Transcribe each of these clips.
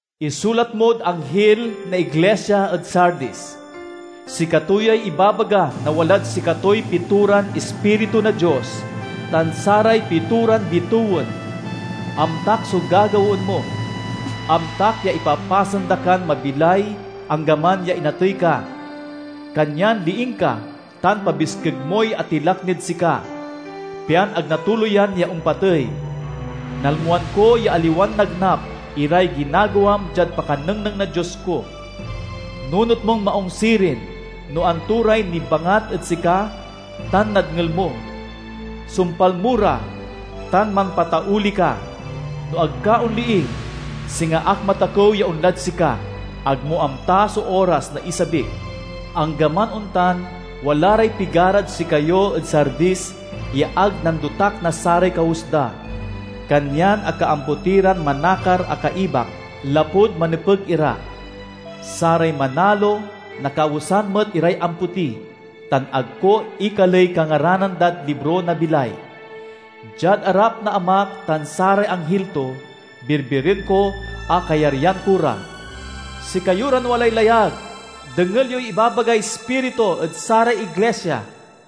"Isulat mod anghil na iglisia ed Sardis: "Sikato yay ibabaga na walad sikatoy pitoran ispiritu na Dios tan saray pitoran bitewen. Amtak so gagawaen mo; amtak ya ipapasen da kan mabilay anggaman ya inatey ka! Kanyan liing ka, tan pabiskeg moy atilak nid sika, pian ag natuloyan ya ompatey. Nalmoan ko ya aliwan nagnap iray ginagawam diad pakanengneng na Dios ko. Nunot mon maung sirin no anto ray nibangat ed sika tan nadngel mo. Sumpal mo ra, tan mampatauli ka. No ag ka onliing, singa ak matakew ya onlad sika—ag mo amta so oras na isabik. Anggaman ontan, wala ray pigarad sikayo ed Sardis ya ag nandotak na saray kawes da. Kanyan akaampoti ran manakar a kaibak, lapud manepeg ira. Saray manalo nakawesan met iray ampoti, tan ag ko ekaley kangaranan dad libro na bilay. Diad arap na Amak tan saray anghil to, birbiren ko a kayaryan ko ra. "Sikayo ran walay layag, dengel yoy ibabagay Ispiritu ed saray iglisia!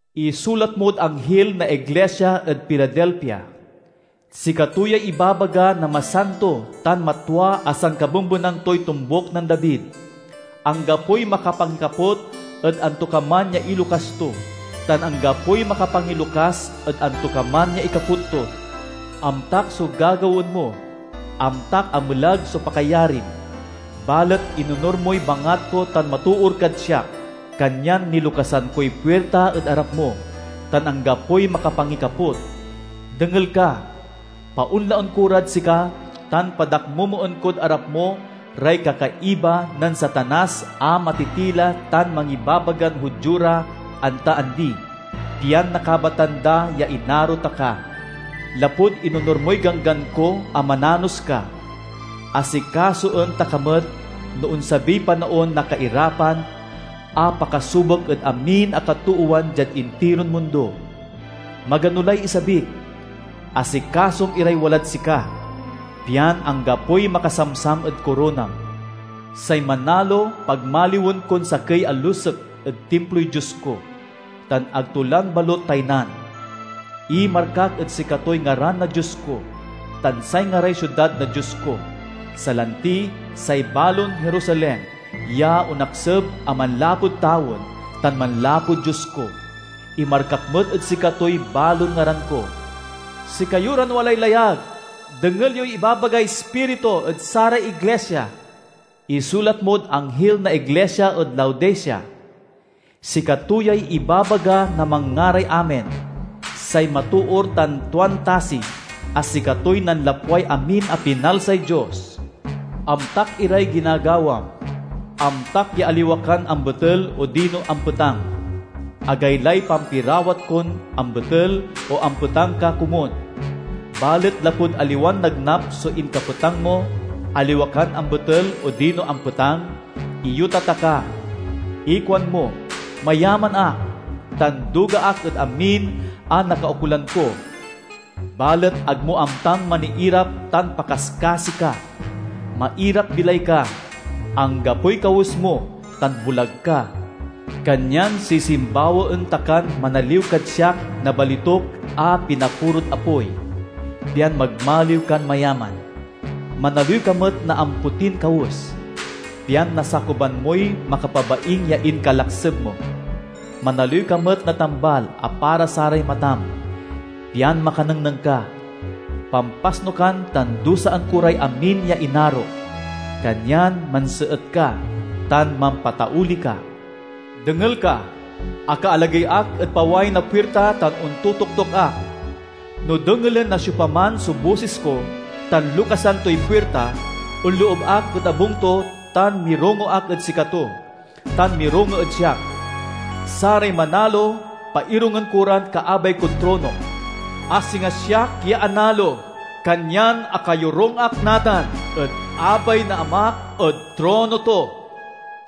"Isulat mod anghil na iglisia ed Filadelfia: "Sikato yay ibabaga na masanto tan matwa a sankabembenan toy tombuk nen David; anggapoy makapangikaput ed antokaman ya ilokas to, tan anggapoy makapangilokas ed antokaman ya ikaput to. Amtak so gagawaen mo; amtak a melag so pakayarim, balet inonur moy bangat ko tan matoor kad siak. Kanyan nilokasan koy puirta ed arap mo, tan anggapoy makapangikaput. Dengel ka! Paonlaen ko rad sika tan padakmomoen kod arap mo ray kakaiba nen Satanas a matitila tan mangibabagan Judio ra anta andi, pian nakabatan da ya inaro ta ka. Lapud inonur moy ganggan ko a mananos ka, asikasoen ta ka met no onsabiy panaon na kairapan a pakasubok ed amin a katoowan diad intiron mundo. Magano lay isabik. Asikasom iray walad sika, pian anggapoy makasamsam ed koronam. Say manalo pagmaliwen kon sakey a lusek ed timploy Dios ko, tan ag to lan balut taynan. Imarkak ed sikatoy ngaran na Dios ko, tan say ngaray siudad na Dios ko, salanti say balon Jerusalem ya onakseb a manlapud tawen tan manlapud Dios ko. Imarkak met ed sikatoy balon ngaran ko. "Sikayo ran walay layag, dengel yoy ibabagay Ispiritu ed saray iglisia! "Isulat mod anghil na iglisia ed Laodicea: "Sikato yay ibabaga na manngaray Amen, say matoor tan tuan tasi, a sikatoy nanlapway amin a pinalsay Dios. Amtak iray ginagawam; amtak ya aliwa kan ambetel odino ampetang. Agaylay pampirawat kon ambetel o ampetang ka komun! Balet lapud aliwan nagnap so inkapetang mo, aliwa kan ambetel odino ampetang, iyota ta ka! Ikuanmo, 'Mayaman ak, tan duga ak ed amin a nakaukolan ko!' Balet ag mo amtan maniirap tan pakaskasi ka! Mairap-bilay ka, anggapoy kawes mo, tan bulag ka. Kanyan sisimbawaen ta kan manaliw kad siak na balituk a pinapurod apoy, pian magmaliw kan mayaman. Manaliw ka met na ampotin kawes, pian nasakuban moy makapabaing ya inkalakseb mo. Manaliw ka met na tambal a para saray matam, pian makanengneng ka. Pampasnukan tan dusaen ko ray amin ya inarok. Kanyan manseet ka, tan mampatauli ka. Dengel ka! Aka-alagey ak ed paway na puirta tan ontotoktok ak. No dengelen na siopaman so bosis ko tan lokasan toy puirta, onloob ak ed abung to tan mirongo ak ed sikato, tan mirongo ed siak. Saray manalo pairungen ko ran kaabay kod tronok, a singa siak ya analo, kanyan akayorung ak natan ed abay na Amak ed trono to.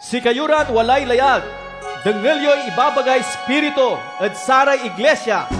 "Sikayo ran walay layag, dengel yoy ibabagay Ispiritu ed saray iglisia!"